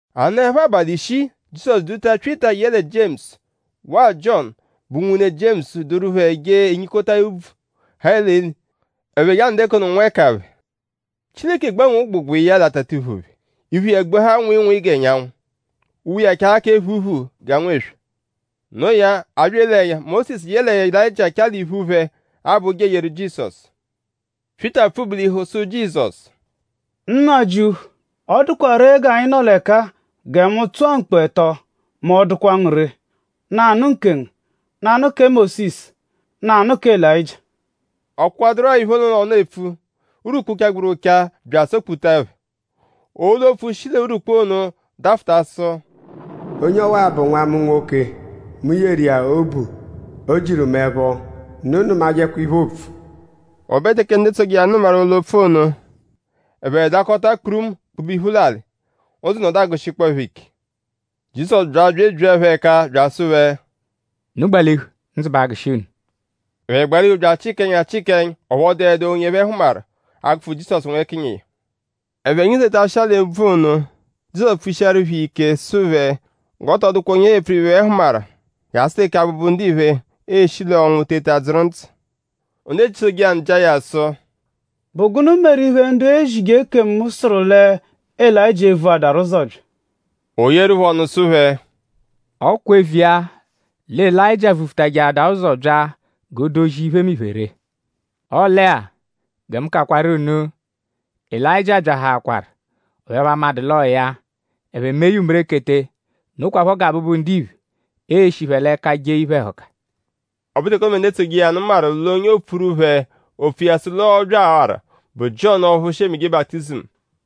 A nọepho abalị ishii; Jizọsu duta Pyịta yẹle Jiemusu; waa Jiọnu, bụ nwune Jiemusu duru phẹ je enyikota úbvú, ha l'eli; ẹphe je anọdu nwẹkaphe. Chileke gbanwee ụgbugba iya l'atatiphu phẹ. Iphu iya gbuahaa nwịinwii g'ẹnyanwu. Uwe iya chaahaa kẹ phuuphuu g'anwụ eswe. Noo ya; a bya ele ẹnya; Mósisu yẹle Elayịjia chaa l'iphu phẹ; abọ ụja eyeru Jizọsu. Pyịta pfụ-bulihu sụ Jizọsu: “Nnajịuphu; ọ dụkwa ree g'anyi nọ l'ẹka-a; gẹ mu tụa mkpu ẹto mẹ ọ -dụkwa ngu ree; nanụ nkengu; nanụ kẹ Mósisu; nanụ kẹ Elayịjia.” Ọ kpụkwaduru-a iphe ono l'ọnu epfu; urwukpu, chagburu ụcha bya asọ-kputa phẹ. Olu-opfu shi l'urwukpu ono dafụta sụ: “Onye ọwa-a bụ nwa mu nwoke. Mu yeru iya obu. O jiru mu ẹpho. Unu nụmajekwa iphe, oopfu!” O be teke ndu etsoje iya nụ nụmaru olu-opfu ono; ẹphe dakọta kpurumu kpube iphu l'alị. Ndzụ nọdu agụshikpoo phẹ ike. Jizọsu bya bya ebyia phẹ ẹka bya asụ phẹ: “Unu gbalihu. Ndzụ ba agụshi unu.” Ẹphe gbalihu bya achịkaa ẹnya; chịkaa ẹnya; ọphu ọ dụedu onye ẹphe hụmaru; a -gụfu Jizọsu nwẹkinyi iya. Ẹphe nyizetashịa l'úbvú ono; Jizọsu pfushiaru phẹ iya ike sụ phẹ g'ọ tọ dụkwa onye ẹphe e-pfuru iphe, ẹphe hụmaru jasụ teke Abụbu-Ndiphe e-shi l'ọnwu teta dzụru ndzụ. Ndu etsoje iya nụ jịa ya sụ: “?Bụ gụnu meru iphe, ndu ezije ekemu sụru lẹ Elayịjia e-vuadaru ụzo bya?” O yeeru phẹ ọnu sụ phẹ: “Ọ kwa eviya lẹ Elayịjia vufutajẹadaa ụzo bya g'o dozia iphemiphe ree. Ọle-a; gẹ mu kakwaru unu: Elayịjia byahaakwaru; ọphu ẹphe amadụ l'ọo ya. Ẹphe mee ya umerekete. Nokwaphọ gẹ Abụbu-Ndiphe e-shi phẹ l'ẹka jee iphe-ẹhuka.” Ọ bụru teke ono bẹ ndu etsoje iya nụ maru l'onye oopfuru phẹ opfu iya sụ l'ọ byawaru bụ Jiọnu ọphu shi emeje baputizimu.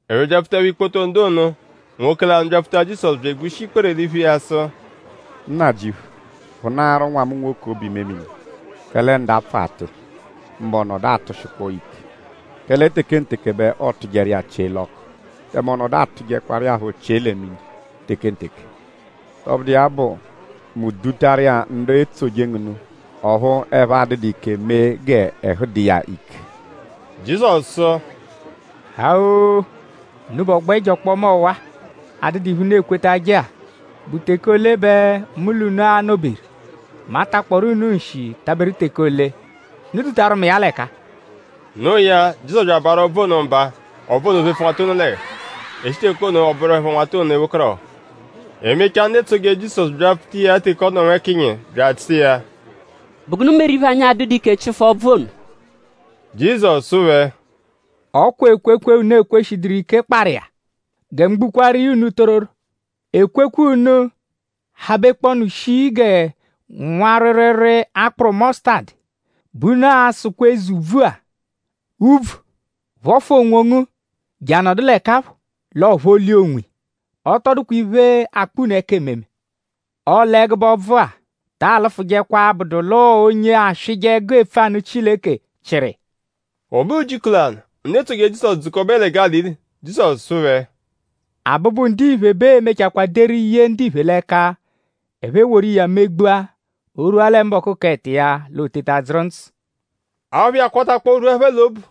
Ẹphe byapfutaẹpho ikpoto ndu ono; nwoke lanụ byapfuta Jizọsu bya egbushi ikpere l'iphu iya sụ: “Nnajịuphu; phụnaaru nwa mu nwoke obu-imemini; kẹle ndapfụ atụ iya; mbụ ọ nọdu atụshikpoo ya ike. Kẹle tekenteke bẹ ọotujeru iya chie l'ọku; tẹme ọ nọdu atụjekwaru iya phọ chie lẹ mini tekenteke. Tọbudu iya bụ; mu dutaru iya ndu etsoje ngu nụ; ọphu ẹphe adụdu ike mee g'ẹhu dụ iya ike.” Jizọsu sụ: “Haa-oo! Unubẹ ọgbo ẹjo ọkpoma ọwa-a, adụdu iphe, unu ekwetajẹ-a.?Bụ teke ole bẹ mu l'unu a-nọ-beru??Mu a-takpọru unu nshi taberu teke ole? Unu dutaru mu iya l'ẹka-a.” No iya; Jizọsu bya abaarụ ọbvu ono mba. Ọbvu ono phefu nwata ono l'ẹhu. E shi teke ono ọ bụerupho nwata ono ewekọrohu. E mechaa; ndu etsoje Jizọsu byapfuta iya teke ọ nọ nwẹkiya; bya asụ iya: “?Bụ gụnu meru iphe, anyi adụdu ike chịfu ọbvu ono?” Jizọsu sụ phẹ: “Ọ kwa ekwekwe, unu ekweshiduru ike kparụ iya. Gẹ mu gbukwaaru iya unu tororo; ekwekwe unu -habekpọonu shii gẹ nwa rwịirwiirwii akpụru mọsutadu bẹ unu a-sụkwa eze úbvú-a; ‘Úbvú; phọfu onwongu je anọdu l'ẹka phọ.’ L'ọo-phọlia onwiya. Ọ tọ dụkwa iphe, a-kpọ unu ẹka ememe. Ọle ẹgube ọbvu-a ta alụfujekwa abụdu l'ọo onye aswịje ẹgu epfu anụ Chileke chịru iya.” O be ujiku lanụ; ndu etsoje Jizọsu dzukọbe lẹ Gálili; Jizọsu sụ phẹ: “Abụbu-Ndiphe bẹ ee-mechakwaa deru ye ndiphe l'ẹka. Ẹphe eworu iya megbua. O -rwua lẹ mbọku k'ẹto iya l'o teta dzụru ndzụ.” Aphụ iya kwatakpọo rwua phẹ l'obu.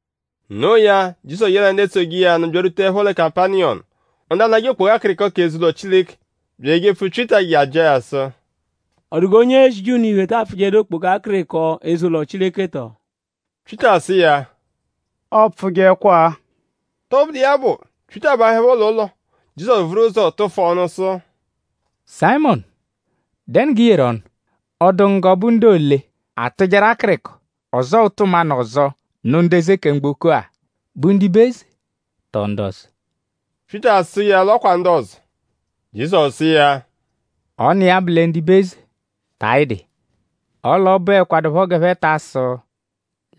Noo ya; Jizọsu yẹe ndu etsoje iya nụ byarwutaẹpho Kapaniyọmu; ndu anajẹ okpoga akịriko k'eze-ụlo Chileke bya ejepfu Pyịta je ajịa ya sụ: “?Ọ dụ g'onye ezije unu iphe ta apfụjedu okpoga akịriko eze-ụlo Chileke tọo?” Pyịta sụ iya: “Ọ pfụjekwa-a.” Tọbudu iya bụ; Pyịta bahụepho l'ụlo; Jizọsu vuru ụzo tụfu ọnu sụ: “Sayịmonu;?dẹnu g'ị yeru ọnu??Ọ dụ ngu g'ọ bụ ndu ole atụjeru akịriko; ọzoo ụtu mmanụ ọzo; nụ ndu eze kẹ mgboko-a??Bụ ndibe eze; tọo ndu ọzo?” Pyịta sụ iya l'ọ kwa ndu ọzo. Jizọsu sụ iya: “Ọ n'iya bụ lẹ ndibe eze ta ayịdu iya. Ọle ọ bụekwadupho g'ẹphe ta asụ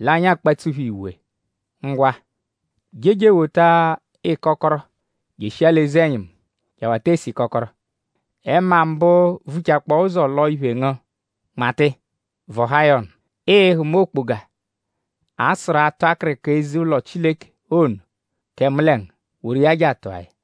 l'anyi akpatsu phẹ iwe. Ngwa; je je ewota ịkokoro jeshia l'eze-ẹnyimu je awata ese ịkokoro. Ẹma mbụ, vuchakpọo ụzo lọo iphe ngu: nmata iya; vọhaa ya ọnu. Ịi-hụma okpoga, a-sụru atụ akịriko eze-ụlo Chileke ono kẹ mu lẹ ngu. Woru iya je atụa ya.”